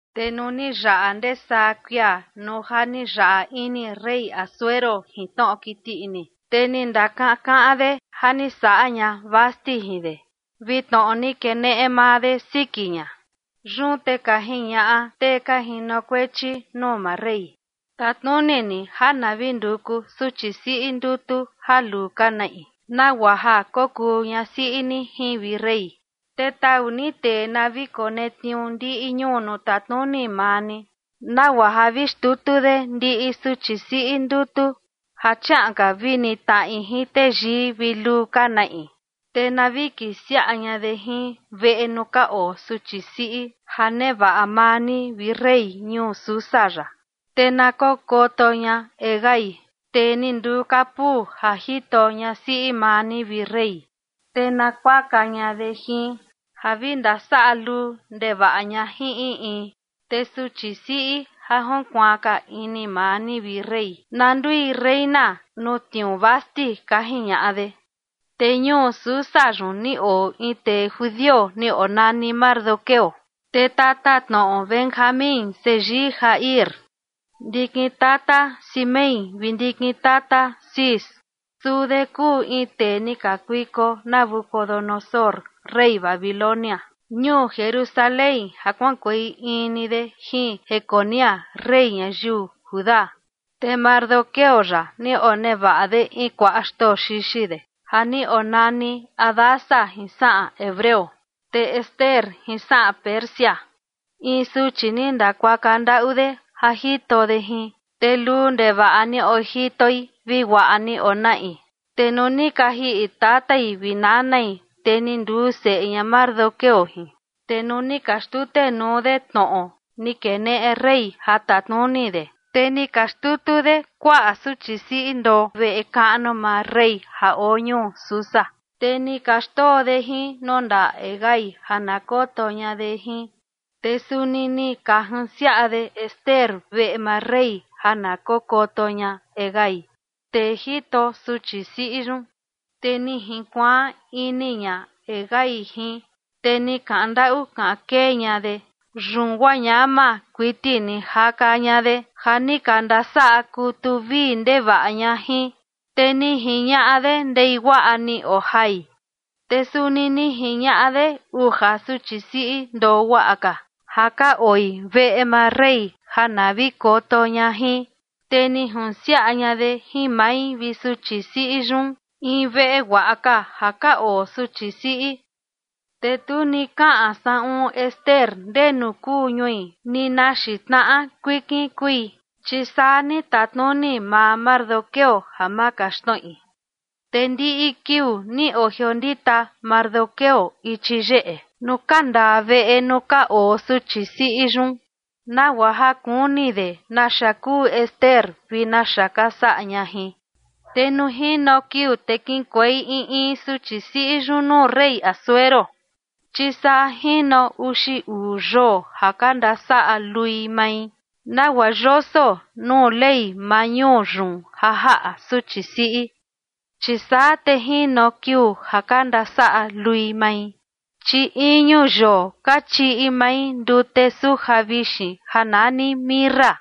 Te nuu ni yaꞌa ndesaa kuia nuu ja ni yaꞌa ini rey Asuero jin tnoꞌo kiti ini, te ni ndakakaꞌan de ja ni saꞌa ña Vasti jin de, vi tnoꞌo ni keneꞌe maa de siki ña. Yun te ka jiñaꞌa tee ka jinokuechi nuu maa rey: ―Tatnuni ni ja na vi nduku suchi siꞌi ndutu ja luu ka naꞌi nagua ja kokuu ñasiꞌi ni jin, vi rey. Te tau ni tee na vi konetniuu ndiꞌi ñuu nuu tatnuni maa ni, nagua ja na vi xtutu de ndiꞌi suchi siꞌi ndutu ja chiaꞌan ka vi nitnaꞌi jin teyii vi luu ka naꞌi, te na vi kisiaꞌa ña de jin veꞌe nuu ka oo suchi siꞌi ja nevaꞌa maa ni, vi rey, ñuu Susa yaꞌa. Te na kokoto ña Hegai, tee ni nduu kapuu ja jito ñasiꞌi maa ni, vi rey, te na kuaka ña de jin ja vi ndasaꞌa luu ndevaꞌa ña jin in in. Te suchi siꞌi ja junkuaan ka ini maa ni, vi rey, na ndui reina nuu tniuu Vasti ―ka jiñaꞌa de. Te ñuu Susa yun ni oo in tee judio ni onani Mardoqueo, tee tatatnoꞌo Benjamín, seyii Jair, ndikin tata Simei vi ndikin tata Cis. Suu de kuu in tee ni kakuiko Nabucodonosor rey Babilonia ñuu Jerusalén ja kuaꞌankuei in ni de jin Jeconías, rey ñayiu Judá. Te Mardoqueo yaꞌa ni onevaꞌa de in kuaꞌa xtoo xixi de ja ni onani Hadasa jin saꞌan hebreo, te Ester jin saꞌan Persia, in suchi ni ndakuaka ndaꞌu de ja jito de jin, te luu ndevaꞌa ni ojitoi vi guaꞌa ni onaꞌi. Te nuu ni ka jiꞌi tatai vi nanai, te ni nduu seꞌe ña Mardoqueo jin. Te nuu ni ka xtutenuu de tnoꞌo ni keneꞌe rey ja tatnuni de, te ni ka xtutu de kuaꞌa suchi siꞌi ndoo veꞌe kaꞌnu maa rey ja oo ñuu Susa, te ni ka xndoo de jin nuu ndaꞌa Hegai ja na koto ña de jin. Te suni ni ka junsiaꞌa de Ester veꞌe maa rey ja na kokoto ña Hegai, tee jito suchi siꞌi yun. Te ni jinkuaan ini ña Hegai jin, te ni kaꞌan ndaꞌu kaꞌan kee ña de. Yun guaa ñama kuiti ni jaka ña de ja ni ka ndasaꞌa kutu vii ndevaꞌa ña jin, te ni jiñaꞌa de ndei guaꞌa ni ojai. Te suni ni jiñaꞌa de uja suchi siꞌi ndoo guaꞌa ka ja ka oi veꞌe maa rey ja na vi koto ña jin, te ni junsiaꞌa ña de jin mai vi suchi siꞌi yun, in veꞌe guaꞌa ka ja ka oo suchi siꞌi. Te tu ni kaꞌan saꞌun Ester ndenu kuu ñui ni na xiin tnaꞌa kuikin kui, chi saa ni tatnuni maa Mardoqueo ja ma kaxtnoꞌi. Te ndiꞌi kiuu ni ojiondita Mardoqueo ichi yeꞌe nuu kandaa veꞌe nuu ka oo suchi siꞌi yun, nagua ja kuni de naxa kuu Ester vi naxa ka saꞌa ña jin. Te nuu jino kiuu te kiꞌinkuei in in suchi siꞌi yun nuu rey Asuero, chi saa jino uxi uu yoo ja ka ndasaꞌa lui mai, nagua yoso nuu ley maa ñuu yun ja jaꞌa suchi siꞌi, chi saa te jino kiuu ja ka ndasaꞌa lui mai. Chi iñu yoo ka chiꞌi mai ndute suja vixin ja nani mirra,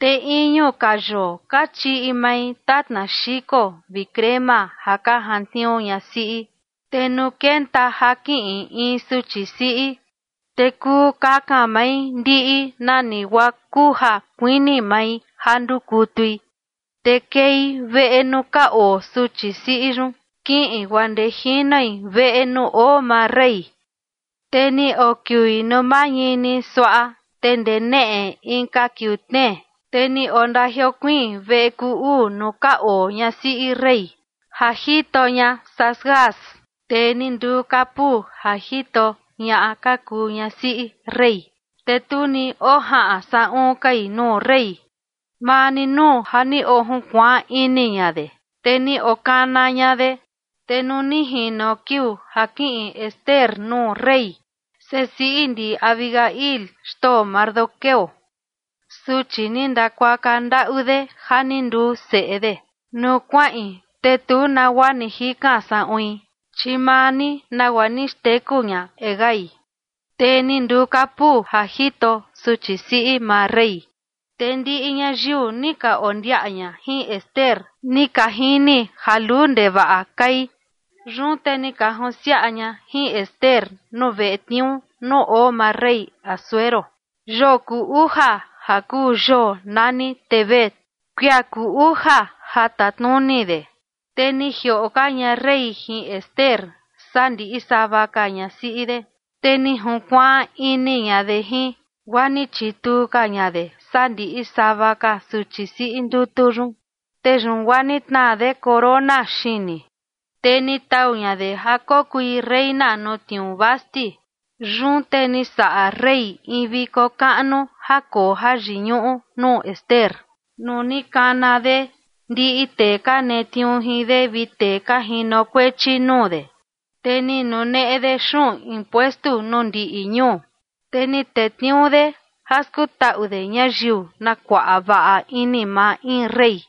te iñu ka yoo ka chiꞌi mai tatna xiko vi crema ja ka jantniuu ñasiꞌi. Te nuu kenta ja kiꞌin in suchi siꞌi, te kuu kakan mai ndiꞌi nani guaa kuu ja kuini mai ja ndukutui, te kei veꞌe nuu ka oo suchi siꞌi yun kiꞌin guaa ndee jinoi veꞌe nuu oo maa rey. Te ni okiui nuu mañini suaꞌa, te ndee neꞌe inka kiuu tnee, te ni ondajiokuiin veꞌe kuu uu nuu ka oo ñasiꞌi rey, ja jito ña Saasgaz, tee ni nduu kapuu ja jito ñaꞌa ka kuu ñasiꞌi rey. Te tu ni ojaꞌan saꞌun kai nuu rey, maa ni nuu ja ni ojunkuaan ini ña de, te ni okana ña de. Te nuu ni jino kiuu ja kiꞌin Ester nuu rey, sesiꞌi ndi Abihail, xtoo Mardoqueo, suchi ni ndakuaka ndaꞌu de ja ni nduu seꞌe de, nuu kuaꞌin te tu nagua ni jikan saꞌuin, chi maa ni nagua ni xteku ña Hegai, tee ni nduu kapuu ja jito suchi siꞌi maa rey. Te ndiꞌi ñayiu ni ka ondiaꞌa ña jin Ester, ni ka jini ja luu ndevaꞌa kai. Yun te ni ka jinsiaꞌa ña jin Ester nuu veꞌe tniuu nuu oo maa rey Asuero, yoo kuu uja ja kuu yoo nani Tebet, kuia kuu uja ja tatnuni de. Te ni jioꞌo ka ña rey jin Ester saa ndiꞌi sava ka ñasiꞌi de, te ni junkuaan ini ña de jin, guaa ni chituu ka ña de saa ndiꞌi sava ka suchi siꞌi ndutu yun. Te yun guaa ni tnaa de corona xini, te ni tau ña de ja kokui reina nuu tniuu Vasti. Yun te ni saꞌa rey in viko kaꞌnu ja koo jayiñuꞌu nuu Ester nuu ni kana de ndiꞌi tee ka netniuu jin de vi tee ka jinokuechi nuu de. Te ni nuneꞌe de xuꞌun impuestu nuu ndiꞌi ñuu, te ni tetniuu de ja skutaꞌu de ñayiu, na kuaꞌa vaꞌa ini maa in rey.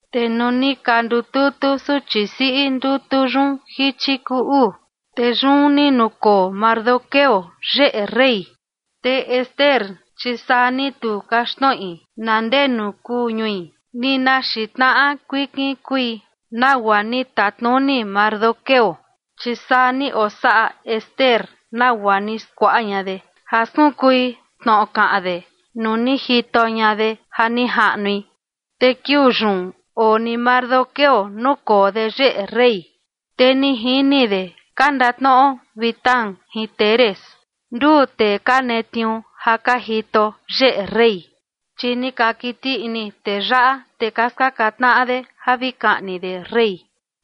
Te nuu ni ka ndututu suchi siꞌi ndutu yun jichi kuu uu, te yun ni nukoo Mardoqueo yeꞌe rey. Te Ester, chi saa ni tu kaxtnoꞌi na ndenu kuu ñui ni na xiin tnaꞌa kuikin kui, nagua ni tatnuni Mardoqueo, chi saa ni osaꞌa Ester nagua ni skuaꞌa ña de ja skunkui tnoꞌo kaꞌan de nuu ni jito ña de ja ni jaꞌnui. Te kiuu yun oo ni Mardoqueo nukoo de yeꞌe rey, te ni jini de ka ndatnoꞌo Bigtán jin Teres, nduu tee ka netniuu ja ka jito yeꞌe rey. Chi ni ka kiti ini tee yaꞌa, te ka skaka tnaꞌa de ja vi kaꞌni de rey.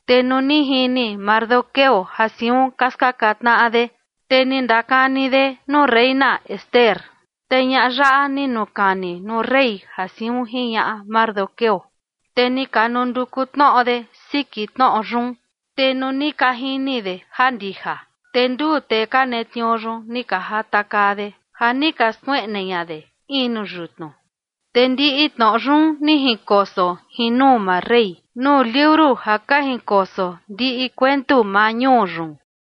Te nuu ni jini Mardoqueo ja siun ka skaka tnaꞌa de, te ni ndakani de nuu reina Ester, te ñaꞌa yaꞌa ni nukani nuu rey ja siun jiñaꞌa Mardoqueo. Te ni ka nduku tnoꞌo de siki tnoꞌo yun, te nuu ni ka jini de ja ndija, te nduu tee ka netniuu yun ni ka jatakaa de ja ni ka skueꞌne ña de in nuu yutnu. Te ndiꞌi tnoꞌo yun ni jinkoso jin nuu maa rey nuu liuru ja ka jinkoso ndiꞌi kuentu maa ñuu yun.